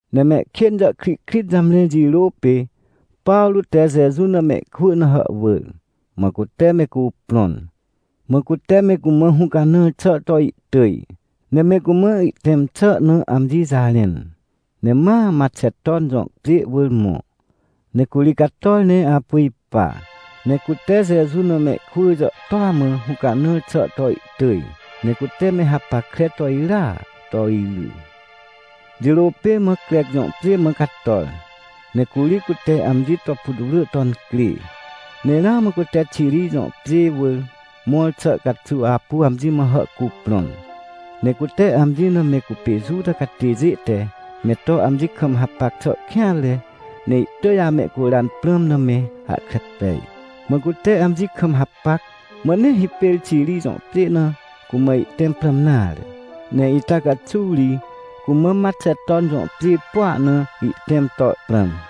Ne mehkên jàhkrihkrit jamre jirô pê, Pawrô te Jeju na mehkwỳ na hàhwỳr, mã cute me cuprõn. Mã cute me cumã hũcanãr xà to ihtỳj, ne me cumã ihtẽm xà na amji jarẽn. Ne ma Maxeton jõ pjê wỳr mõ. Ne curi cator ne apu ipa, ne cute Jeju na mehkwỳ jàhtôa mã hũcanãr xà to ihtỳj, ne cute me hapackre to irya to iry. Jirô pê ma Crec jõ pjê mã cator, ne curi cute amji to putwrỳ to incrê. Ne ramã cute Xiri jõ pjê wỳr mõr xà caxuw apu amji mã hàhcuprõn, ne cute amji na me cupê Juta catêjê te me to amji kam hapac xà kêanre, ne ihtỳj amehcuran prãm na me hahkre pej. Mã cute amji kam hapac, mã nee hipêr Xiri jõ pjê na cumã ihtẽm prãm nare. Ne ita caxuw ri cumã Maxeton jõ pjê pua na ihtẽm to prãm.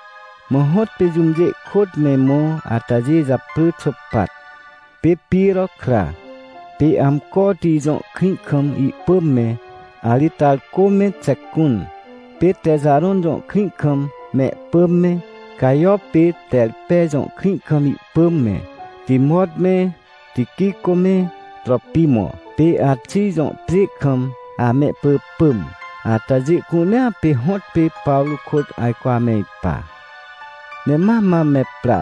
Mã hõtpê jũmjê ihkôt me mõ atajê japrỳ Xôpat, pê Piro kra, pê Amcoti jõ krĩ kam ihpỳm me, Aritarcô me Xecun, pê Texarõn jõ krĩ kam mehpỳm me, Cajo pê Terpe jõ krĩ kam ihpỳm me, Timot me Tiquicô me Tropimo, pê Axij jõ pjê kam amehpỳpỳm. Atajê cunea pê hõtpê Pawrô kôt ajco ame ipa. Ne ma mam me pra,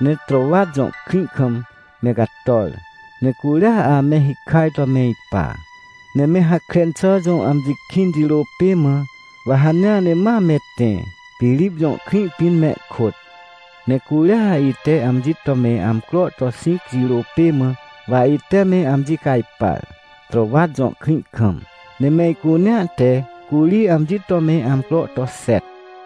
ne Trôwat jõ krĩ kam me cator, ne curia ame hikaj to ame ipa. Ne me Hakren xà jõ amji kĩn jirô pê mã, wa hanea ne ma me tẽ, Pirip jõ krĩ pĩn mehkôt. Ne curia ite amji to me amcro to xĩc jirô pê mã, wa ite me amji cajpar, Trôwat jõ krĩ kam, ne me icunea te curi amji to me amcro to xet.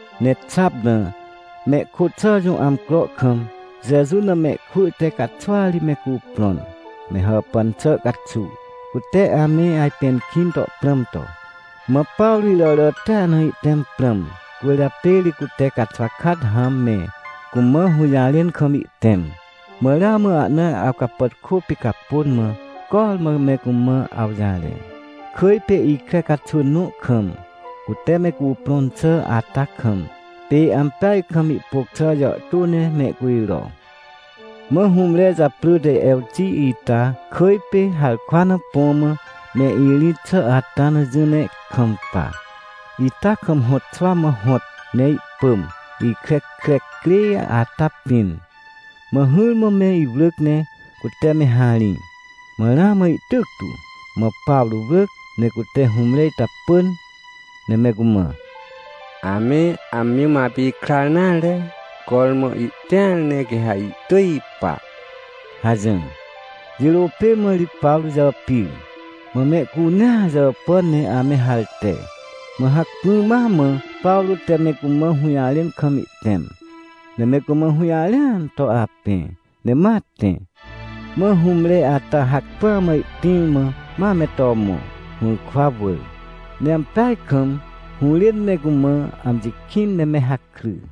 Ne xap na, mehkôt xà jõ amcro kam, Jeju na mehkwỳ te caxwa ri me cuprõn, me hàpàn xà caxuw cute ame ajpẽn kĩn to prãm to. Mã Pawrô iràràtia na ihtẽm prãm, cwỳrjapê ri cute caxwa kat hãm me cumã hũjarẽn kam ihtẽm. Mã ramã ahna awcapàtkô picapôn mã cormã me cumã awjarẽ. Kỳj pê ikre caxwỳn nõ kam, cute me cuprõn xà ata kam, pê ampeaj kam ihpôc xà jàhtô ne mehcujro. Mã hũmre japrỳ te Ewti ita kỳj pê, harkwa na põ mã me irĩt xà ata na jỹ ne kampa, ita kam hõt xwa mã hõt, ne ihpỳm, ikre kre crê ata pĩn. Mã hỹrmã me iwrỳc ne cute me harĩ, mã ramã ihtyc tu. Mã Pawrô wrỳc, ne cute hũmre ita pỳn, ne me cumã: — Ame amji mã apikrar nare. Cormã ihtĩar ne quê ha ihtỳj ipa — hajỹr. Jirô pê mã ri Pawrô jàpir, mã mehcunea jàpàn ne ame harte. Mã hacpỹ ma mã Pawrô te me cumã hũjarẽn kam ihtẽm, ne me cumã hũjarẽan to apẽ, ne ma tẽ. Mã hũmre ata hacpỹa mã ihtĩr mã ma me to mõ, hũrkwa wỳr. Ne ampeaj kam hũrên me cumã amji kĩn, ne me hakry.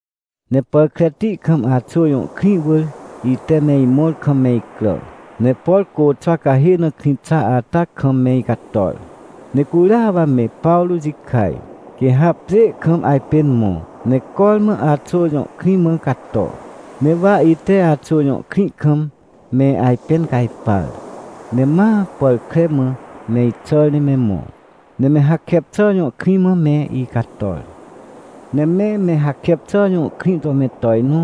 Ne pàr kreti kam Axô jõ krĩ wỳr ite me imõr kam me icrà, ne por côxwa cahê na krĩ xa ata kam me icator. Ne curia wa me Pawrô jikaj, quê ha pjê kam ajpên mõ, ne cormã Axô jõ krĩ mã cato. Ne wa ite Axô jõ krĩ kam me ajpẽn cajpar, ne ma pàr kre mã me ixàr ne me mõ, ne Mehakepxà jõ krĩ mã me icator. Ne me Mehakepxà jõ krĩ to me tojnõ,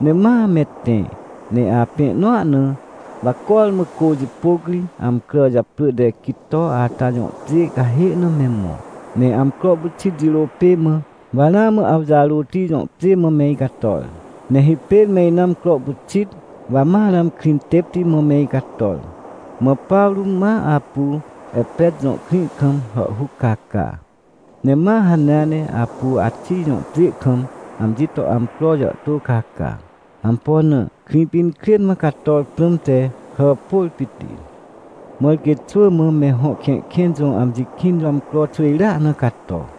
ne ma me tẽ, ne apẽ nõa na wa cormã cô jipôc ri amcrà japrỳ te Quito ata jõ pjê cahê na me mõ. Ne amcro pyxit jirô pê mã, wa ramã Awjarôti jõ pjê mã me icator, ne hipêr me ina amcro pyxit, wa ma ramã Krĩtêpti mã me icator. Mã Pawrô ma apu Epet jõ krĩ kam hàhhuc caca, ne ma hanea ne apu Axij jõ pjê kam amji to amcro jàhtô caca. Ampo na? Krĩpinkrên mã cator prãmte hàpôr pit. Mãr quê xwỳ mã Me Hõ Kẽhkẽn jõ amji kĩn jõ amcro xwỳjrea na cato.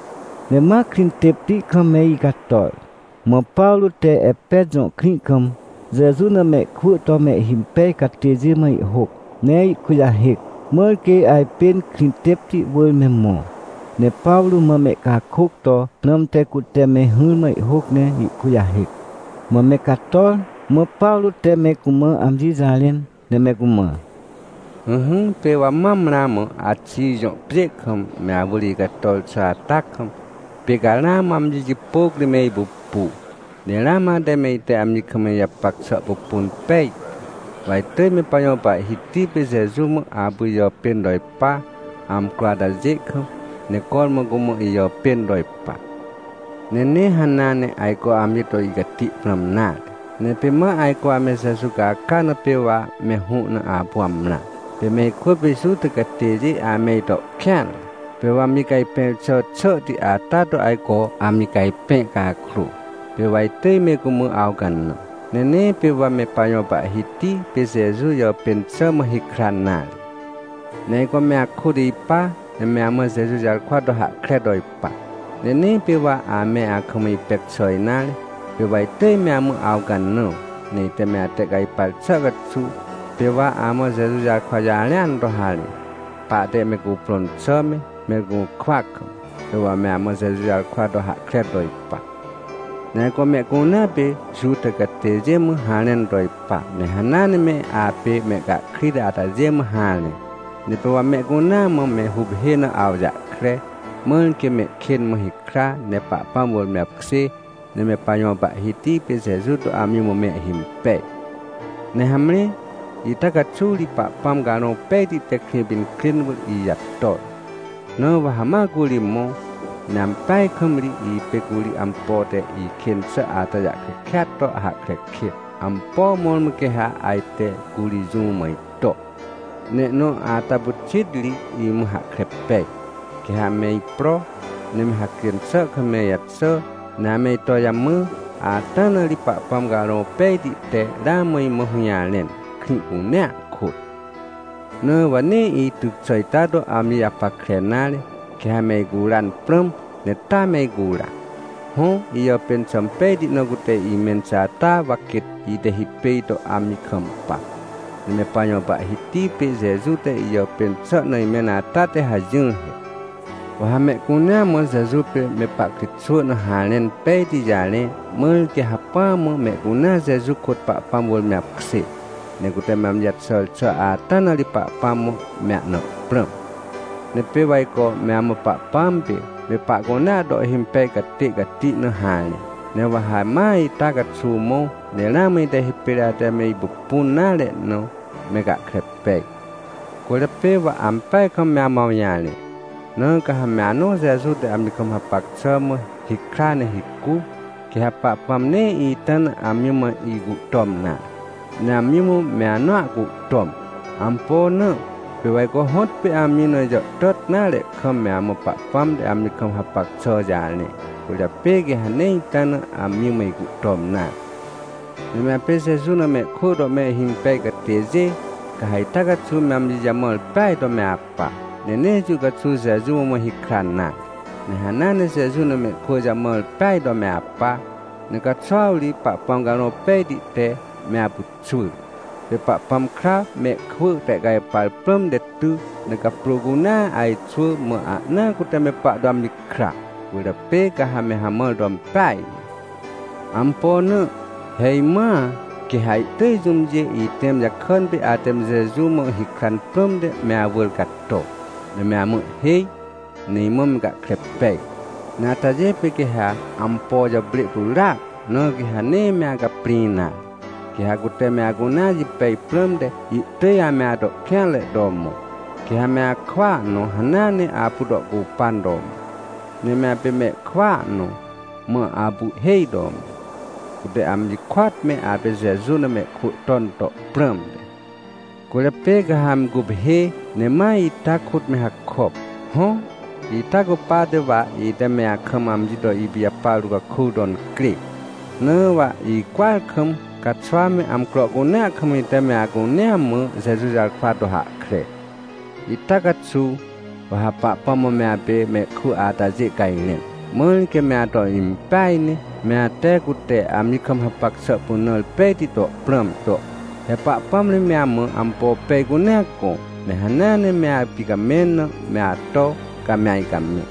Ne ma Krĩtêpti kam me icator, mã Pawrô te Epet jõ krĩ kam Jeju na mehkwỳ to mehhimpej catêjê mã ihhôc, ne ihkujahêc, mãr quê ajpên Krĩtêpti wỳr me mõ, ne Pawrô mã mehcakôc to prãmte cute me hỹrmã ihhôc ne ihkujahêc. Mã me cator, mã Pawrô te me cumã amji jarẽn ne me cumã: — Ỹhỹ, pê wa mam ramã Axij jõ pjê kam me awỳr icator xà ata kam, pê ca ramã amji jipôc ri me ipupu, ne ramã ate me ite amji kam ijapac xà pupun pejtu. Wa itỳj me pajõ Pahhiti pê Jeju mã apu ijàpên to ipa, amcro atajê kam, ne cormã cumã ijàpên to ipa. Ne nee hanea ne ajco amji to icati prãm nare, ne pê ma ajco ame Jeju caca na pê wa me hũ na apu amrã. Pê me ikwỳ pê Juta catêjê ame ito kêanre, pê wa amji cajpẽr xà xàhti ata to ajco amji cajpẽ cakrô, pê wa itỳj me cumã awcanã, ne nee pê wa me pajõ Pahhiti pê Jeju jàpên xà mã hikran nare. Ne ajco me akôt ipa, ne me amã Jeju jarkwa to hahkre to ipa. Ne nee pê wa ame akam ipec xà nare. Pê wa itỳj me amã awcanã ne ite me atehcajpar xà caxuw, pê wa amã Jeju jarkwa jarẽan to harẽ, pahte me cuprõn xà me, me gũrkwa kam, pê wa me amã Jeju jarkwa to hahkre to ipa. Ne ajco mehcunea pê Juta catêjê mã harẽn to ipa, ne hanea ne me apê mehcahkrit atajê mã harẽ. Ne pê wa mehcunea mã me huphê na awjahkre, mãr quê mehkên mã hikra, ne Pahpãm wỳr me apkjê, ne me pajõ Pahhiti pê Jeju to amji mã mehhimpej. — Ne hamre, ita caxuw ri Pahpãm Carõ Pejti te Krĩpinkrên wỳr ijator. Na wa ha ma curi mõ. Ne ampeaj kam ri ipê curi ampo te ikên xà ata jahkre kêat to hahkre kêt, ampo mõrmõ quê ha ajte curi jũ mã ito. Ne ihnõ ata pyxit ri imã hahkre pej, quê ha me ipro, ne me hacjên xà kam me ijaxà, ne ame ito jamã, ata na ri Pahpãm Carõ Pejti te ramã imã hũjarẽn, krĩ cunea kôt. Na wa nee ityc xà ita to amji japackre nare, quê ha me icuran prãm, ne taa me icura. Hõ, ijàpên xà impejti na cute imẽn xà ata wa quêt ite hipêj to amji kampa. Ne me pajõ Pahhiti pê Jeju te ijàpên xà na imẽn ata te hajỹr he. Wa ha mehcunea mã Jeju pê me pahkritxwỳ na harẽn pejti jarẽ, mãr quê hacpỹa mã mehcunea Jeju kôt Pahpãm wỳr me apkjê, ne cute me amji jaxàr xà ata na ri Pahpãm mã me ahna prãm. — Ne pê wa ajco me amã Pahpãm pê me pahcunea to ihhimpej catê cati na harẽ. Ne wa ha ma ita caxuw mõ, ne ramã ite hipêr ate me ipupun nare na me gahkre pej. Cwỳrjapê wa ampeaj kam me amã awjarẽ. Na ca ha me anõ Jeju te amji kam hapac xà mã hikra ne hicu, quê ha Pahpãm nee ita na amji mã icuhtom nare, ne amji mã me anõa cuhtom. Ampo na? Pê wa ajco hõtpê amji na ijàhtàt nare kam me amã Pahpãm te amji kam hapac xà jarẽ, cwỳrjapê quê ha nee ita na amji mã icuhtom nare. — Ne me apê Jeju na mehkwỳ to mehhimpej catêjê, ca ha ita caxuw me amji jamãr peaj to me apa, ne nee jũ caxuw Jeju mã me hikran nare. Ne hanea ne Jeju na mehkwỳ jamãr peaj to me apa, ne caxuw ri Pahpãm Carõ Pejti te me apyxwỳr. Pê Pahpãm kra mehkwỳ tehcajpar prãmte ty, ne caprô cunea ajxwỳ, mã ahnaa cute me pahto amji kra. Cwỳrjapê ca ha me hamãr to impeaj ne. Ampo na? He, imãa quê ha ihtỳj jũmjê itẽm jakàn pê ate me Jeju mã hikran prãmte me awỳr cato, ne me amã ihhêj, ne imã me gahkre pej. Ne atajê pê quê ha ampo jàprê pyràac, na quê ha nee me acaprĩ nare. Quê ha cute me acunea jipej prãmte ihtỳj ame ato kêanre to mõ. Quê ha me akwỳa nõ hanea ne apu to ihcupan to mõ. Ne me apê mehkwỳa nõ mã apu ihhêj to mõ, cute amji kôat me apê Jeju na mehkwỳ ton to prãmte. Cwỳrjapê ca ha me guphê, ne ma ita kôt me hakop. Hõ, ita cupate wa ite me akam amji to ipijapar to caku to incrê. Na wa icwỳar kam, caxwa me amcro cunea kam ite me acunea mã Jeju jarkwa to hahkre. — Ita caxuw, wa ha Pahpãm mã me apê mehkwỳ atajê cajrẽn, mãr quê me ato impeaj ne, me ate cute amji kam hapac xà pynãr pejti to prãm to. He Pahpãm ri me amã ampo pej cunea gõ, ne hanea ne me apicamẽn na me ato, ca me ajcamẽ.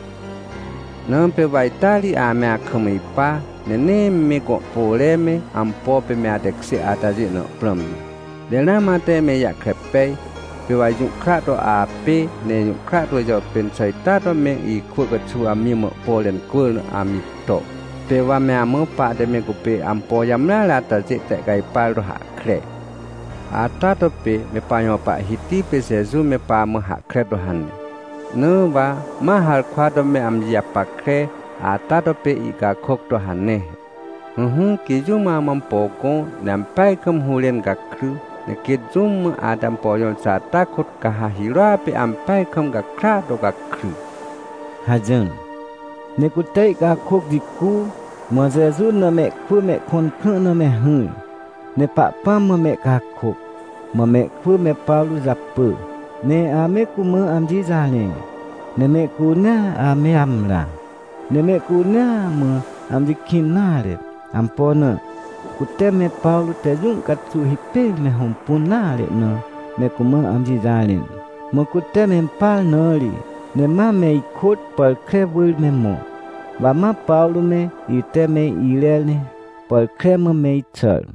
Na pê wa ita ri ame akam ipa, ne nee me gõ pore me, ampo pê me atekjê atajê na prãm nare. Ne ramã ate me ijahkre pej, pê wa ijũhkra to apê, ne ijũhkra to ijàpên xà ita to me ikwỳ caxuw amji mã ihpore incwỳr na amji to, pê wa me amã pahte me cupê ampo jamreare atajê tehcajpar to hahkre. Ata to pê me pajõ Pahhiti pê Jeju me pamã hahkre to hane. Na wa ma harkwa to me amji japackre, ata to pê ihcakôc to hane he: “Ỹhỹ, quê jũm amã ampo gõ, ne ampeaj kam hũrên gakry, ne quêt jũm mã ate ampo jõr xà ata kôt ca ha hirôa pê ampeaj kam gakrya to gakry” — hajỹr. Ne cute ihcakôc jicu, mã Jeju na mehkwỳ mehkõn krã na me hỹr, ne Pahpãm mã mehcakôc. Mã mehkwỳ me Pawrô japỳ, ne ame cumã amji jarẽ, ne mehcunea ame amrã. Ne mehcunea mã amji kĩn nare. Ampo na? Cute me Pawrô te jũ caxuw hipêr me hõmpun nare na me cumã amji jarẽn, mã cute mempar na ri. Ne ma me ikôt pàr kre wỳr me mõ. Wa ma Pawrô me ite me irer ne pàr kre mã me ixàr.